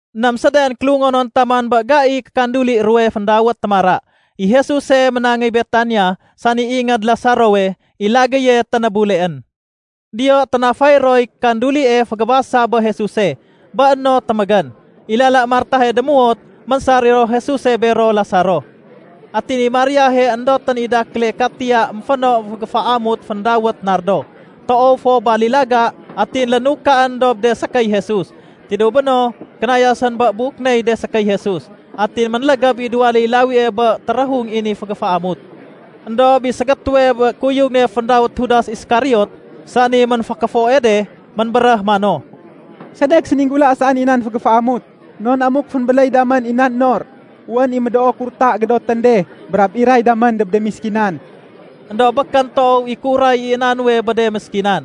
Ném séden kélungonon taman bé gaiy kékanduli ruwe féndawét “Témara”, i Jesuse ménangéy Betania, sani ingéd Lasarowe, i lagéye ténébuleén. Diyo ténafay roy kandulie fégébasa bé Jesuse. Bé no témégén, i lala Martahe démuwot, ménsar i ro Jesuse bero Lasaro. Atin i Mariahe éndotén i dakéle katiya ménféno fégéféamut féndawét nardo, toow fo balilaga, atin lénukaén dob de sékéy Jesus. Tidéw béno, kénayasén bé buk ney de sékéy Jesus. Atin ménlégéb i duwaléy lawie bé téréhung i ni fégéféamut. Endob i ségétéwe bé de kuyugén féndawét Judas Iskariot, sani ménfékéfoe de, ménbéréh mano, “Sedek séninggula saén i nan fégéféamut? Non amuk fénbéléy damén i nan nor, wén i médoo kurta gédotén de brab iray damén dob de méskinan.” Endob békén toow i kéuray i na nuwe bé de méskinan.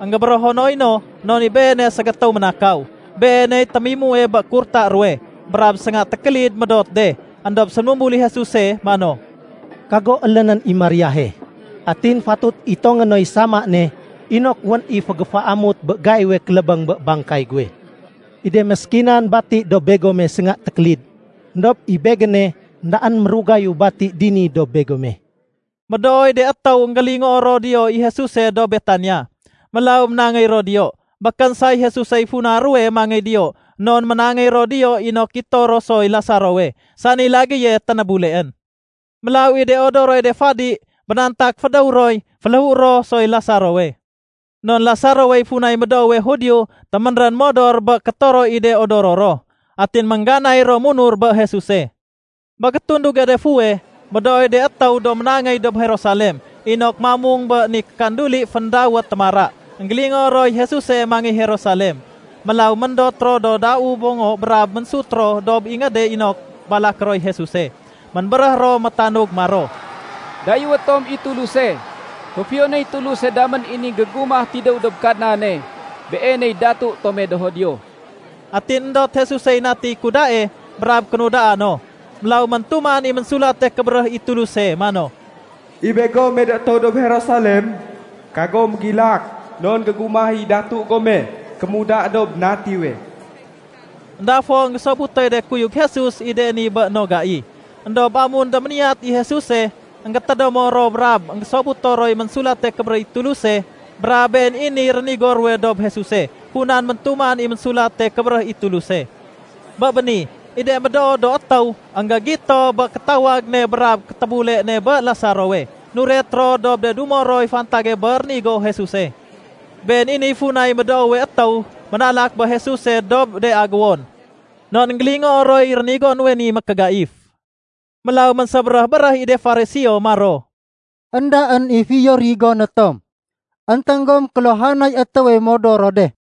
Enggébérého noy no non i beene ségétéw ménakaw. Beeney témimue bé kurta ruwe, brab sénga tékélid médot de. Endob séménumbul i Jesuse mano, “Kago élénén i Mariahe. Atin fatut itongé noy sama ne inok wén i fégéféamut bé gaiwe kélébéng bé bangkay guwe. I de méskinan bati dob begome sénga tékélid. Endob i Begéne, éndaén mérugayu bati dini dob begome.” Médooy de étéw énggélingoo ro diyo i Jesuse dob Betania. Mélaw ménangéy ro diyo. Békén say Jesusey funa ruwe mangéy diyo, non ménangéy ro diyo inok gito ro soy Lasarowe, sani lagéye ténébuleén. Mélaw i de odoroy de fadi bénantak fédéw roy féléhué ro soy Lasarowe. Non Lasarowey funay médoowe Judio téménrén modor bé kétoro i de odoro ro atin méngganay ro munur bé Jesuse. Bé gétunduge de fuweh, médooy de étéw do ménangéy dob Jerusalem inok mamung bé ni kanduli féndawét Témara, énggélingoo roy Jesuse mangéy Jerusalem. Mélaw méndot ro do dau bongo brab ménsut ro dob ingéde inok balaké roy Jesuse. Ménbéréh ro métanug maro, “Dayéwé tom i Tuluse! Féfiyonéy Tuluse damén i ni gégumah tidéw dob Kadnane! Beeney datu tome do Judio!” Atin éndot Jesusey natiy kudae brab kénudaa no. Mélaw méntuman i Ménsulate Kébéréh i Tuluse mano, “I begome do étéw dob Jerusalem, kagom mégilak. Non gégumah i datu gome kémuda dob natiwe.” Enda fo énggésobutoy de kuyug Jesus i de ni bé no gai. Endob amun déméniyat i Jesuse, énggétédémo ro brab énggésobuto roy Ménsulate Kébéréh i Tuluse, brab been i niy rénigo ruwe dob Jesuse funan méntuman i Ménsulate Kébéréh i Tuluse. Bé béni, i de médoo do étéw énggégito bé kétawag ne brab kétébule ne bé Lasarowe, nuret ro dob de dumo roy fantage bé rénigo Jesuse. Been i niy funay médoowe étéw ménalak bé Jesuse dob de agéwon non énggélingoo roy rénigo nuwe ni mékégaif. Mélaw ménsébéréh-béréh i de Fariseo maro, “Endaén i fiyo rigoné tom, énténg gom kéluhanay étéwe modor ro de.”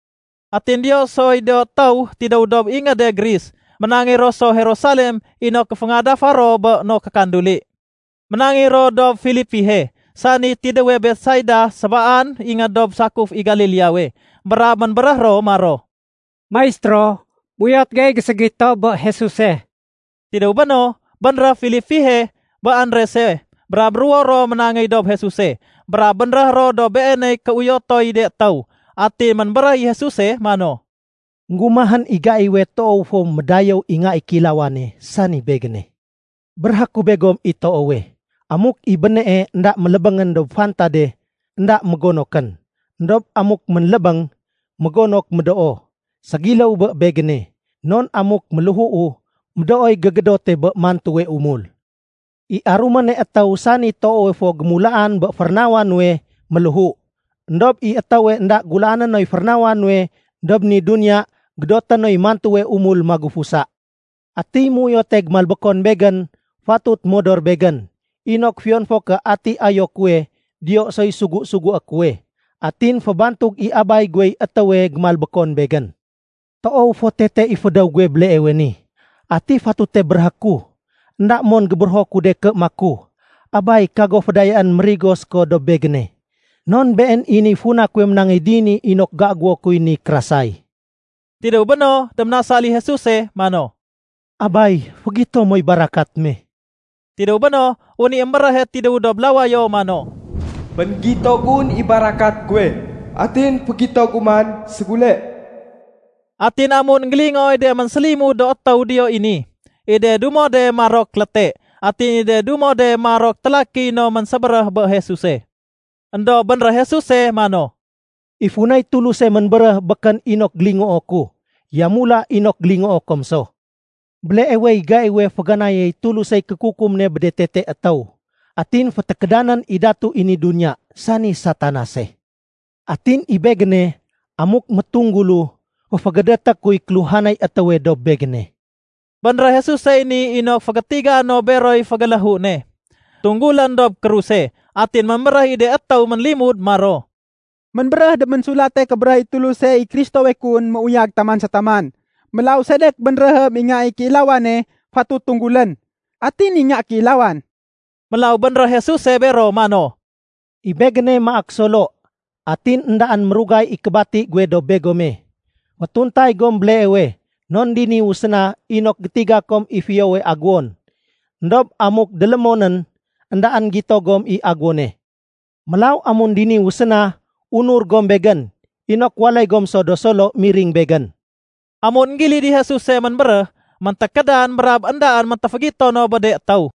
Atin diyo soy do étéw tidéw dob ingéde Gris. Ménangéy ro so Jerusalem inok géféngadafa ro bé no kékanduli. Ménangéy ro dob Filipihe (sani tidéwe Betsaida, sébaan ingéd dob sakuf i Galileawe), brab ménbéréh ro maro, “Maistéro, méuyot gey géségito bé Jesuse.” Tidéw béno, bénréh Filipihe bé Andrese, brab ruwo ro ménangéy dob Jesuse brab bénréh ro dob Beeney kéuyotoy de étéw. Atin ménbéréh i Jesuse mano, “Enggumahén i gaiwe toow fo médayéw i Nga i Kéilawane, sani Begéne. Béréhé ku begom i toowe, amuk i bénee énda mélébéngén dob fantade, énda mégonokén. Endob amuk ménlébéng, mégonok médoo. Ségiléw bé Begéne, non amuk méléhuu, médooy gégédote bé mantuwe umul. I aruméne étéw sani toowe fo gémulaan bé férénawa nuwe, méléhu. Endob i étéwe énda gulaané noy férénawa nuwe dob ni duniya, gédoté noy mantuwe umul magufusa. Atiy méuyote gémalbékon Begén fatut modor Begén, inok fiyon fo ké ati ayo kuwe, diyo soy sugu-sugué kuwe. Atin fébantug i Abay guwey étéwe gémalbékon Begén. “Toow fo tete i fédéw guwe béleewe ni. Ati fatute béréhé ku? Enda mon gébérého ku de ké maku, ‘Abay, kago fédayaén mérigo séko dob Begéne.’ Non been i niy funa kuwe ménangéy dini inok géagéwo kuy ni kérasay.” Tidéw béno, déménasal i Jesuse mano, “Abay, fégito moy barakat me.” Tidéw béno, wén i émbéréhe tidéw dob lawayo mano, “Fénggito gun i barakat guwe atin fégito gu man ségule.” Atin amun énggélingooy de ménsélimud do étéw diyo i ni, i de dumo de marok léte, atin i de dumo de marok télakiy no ménsébéréh bé Jesuse. Endob bénréh Jesuse mano, “I funay Tuluse ménbéréh békén inok gélingoo ku, yamula inok gélingoo kom so. Béleewey gaiwe féganayéy Tulusey kékukum ne bé de tete étéw. Atin fétékédanén i datu i ni duniya, sani Satanase. Atin i Begéne, amuk métunggulu, féfégédété kuy kéluhanay étéwe dob Begéne.” (Bénréh Jesusey ni inok fégétiga no beroy fégéléhu ne, tunggulén dob kruse.) Atin ménbéréh i de étéw ménlimud maro, “Ménbéréh dob Ménsulate Kébéréh i Tuluse i Kristowe kun méuyag taman sa taman. Mélaw sedek bénréhém i Nga i Kéilawane fatut tunggulén? Ati ni Nga Kéilawan?” Mélaw bénréh Jesuse bero mano, “I Begéne maak solo. Atin éndaén mérugay i kébati guwe dob begome. Fétuntay gom béleewe non diniwu séna inok gétiga kom i fiyowe agéwon. Endob amuk délémonén, éndaén gito gom i agéwone. Mélaw amun diniwu séna, unur gom Begén inok waléy gom so do solo miring Begén.” Amun énggilid i Jesuse ménbéréh, méntékédan brab éndaén méntéfégito no bé de étéw.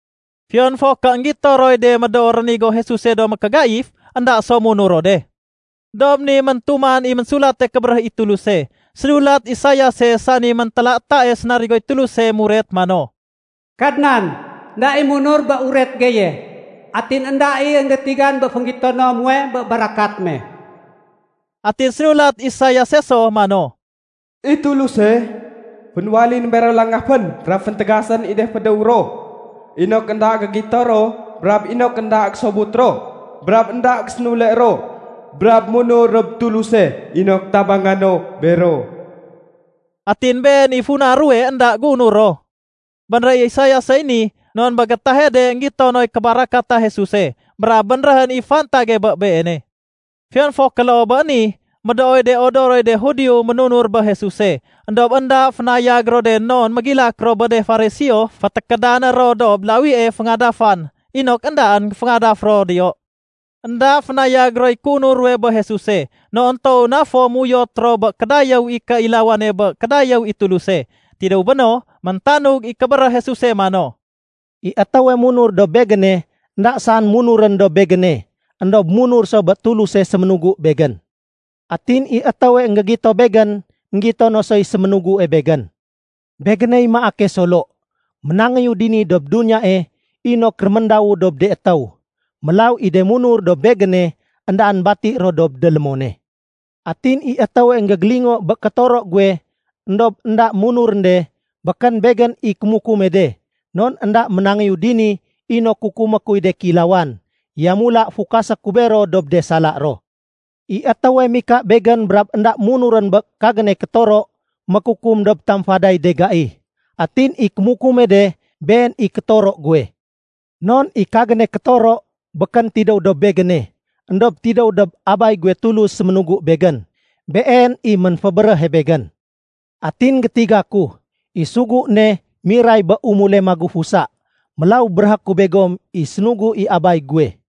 Fiyon fo ké énggito roy de médoo rénigo Jesuse do mékégaif, énda so munur ro de. Dob ni méntuman i Ménsulate Kébéréh i Tuluse, sénulat Isaiase sani méntélatae sénarigoy Tuluse muret mano, “Kadnan, énda i munur bé uret geye, atin énda i énggétigan bé fénggitono muwe bé barakat me.” Atin sénulat Isaiase so mano, “I Tuluse, fénwaléyén bero langafén brab féntégasén i de fédéw ro, inok énda gégito ro brab inok énda gésobut ro brab énda gésénule ro brab munur dob Tuluse inok tabanga no bero.” Atin been i funa ruwe énda géunur ro. Bénréh Isaiasey ni non bé gétahe de énggito noy kébarakata Jesuse brab bénréhén i fantage bé Beene. Fiyon fo ké loo bé ni, médooy de odoroy de Judio ménunur bé Jesuse. Endob énda fénayag ro de non mégilak ro bé de Fariseo fétékédané ro dob lawie féngadafan inok éndaén géféngadaf ro diyo. Enda fénayag roy kéunur ruwe bé Jesuse non toow na fo méuyot ro bé kédayéw i kéilawane bé kédayéw i Tuluse. Tidéw béno, méntanug i kébéréh Jesuse mano, “I étéwe munur dob Begéne, énda saén munurén dob Begéne, éndob munur so bé Tuluse séménugu Begén. Atin i étéwe énggégito Begén, énggito no soy séménugue Begén. Begéney maake solo. Ménangéyu dini dob duniyae inok réméndawu dob de étéw. Mélaw i de munur dob Begéne, éndaén bati ro dob délémone. Atin i étéwe énggégélingo bé kétoro guwe éndob énda munurén de, békén Begén i kémukume de, non énda ménangéyu dini inok kukumé kuy de kéilawan, yamula fukasé ku bero dob de sala ro. I étéwe mika Begén brab énda munurén bé kagéne kétoro, mékukum dob tamfaday de gai. Atin i kémukume de, been i kétoro guwe. Non i kagéne kétoro békén tidéw dob Begéne, éndob tidéw dob Abay guwe Tulus séménugu Begén. Been i ménfébéréhe Begén. Atin gétiga ku, i sugu ne miray bé umule magufusa. Mélaw béréhé ku begom i sénugu i Abay guwe.”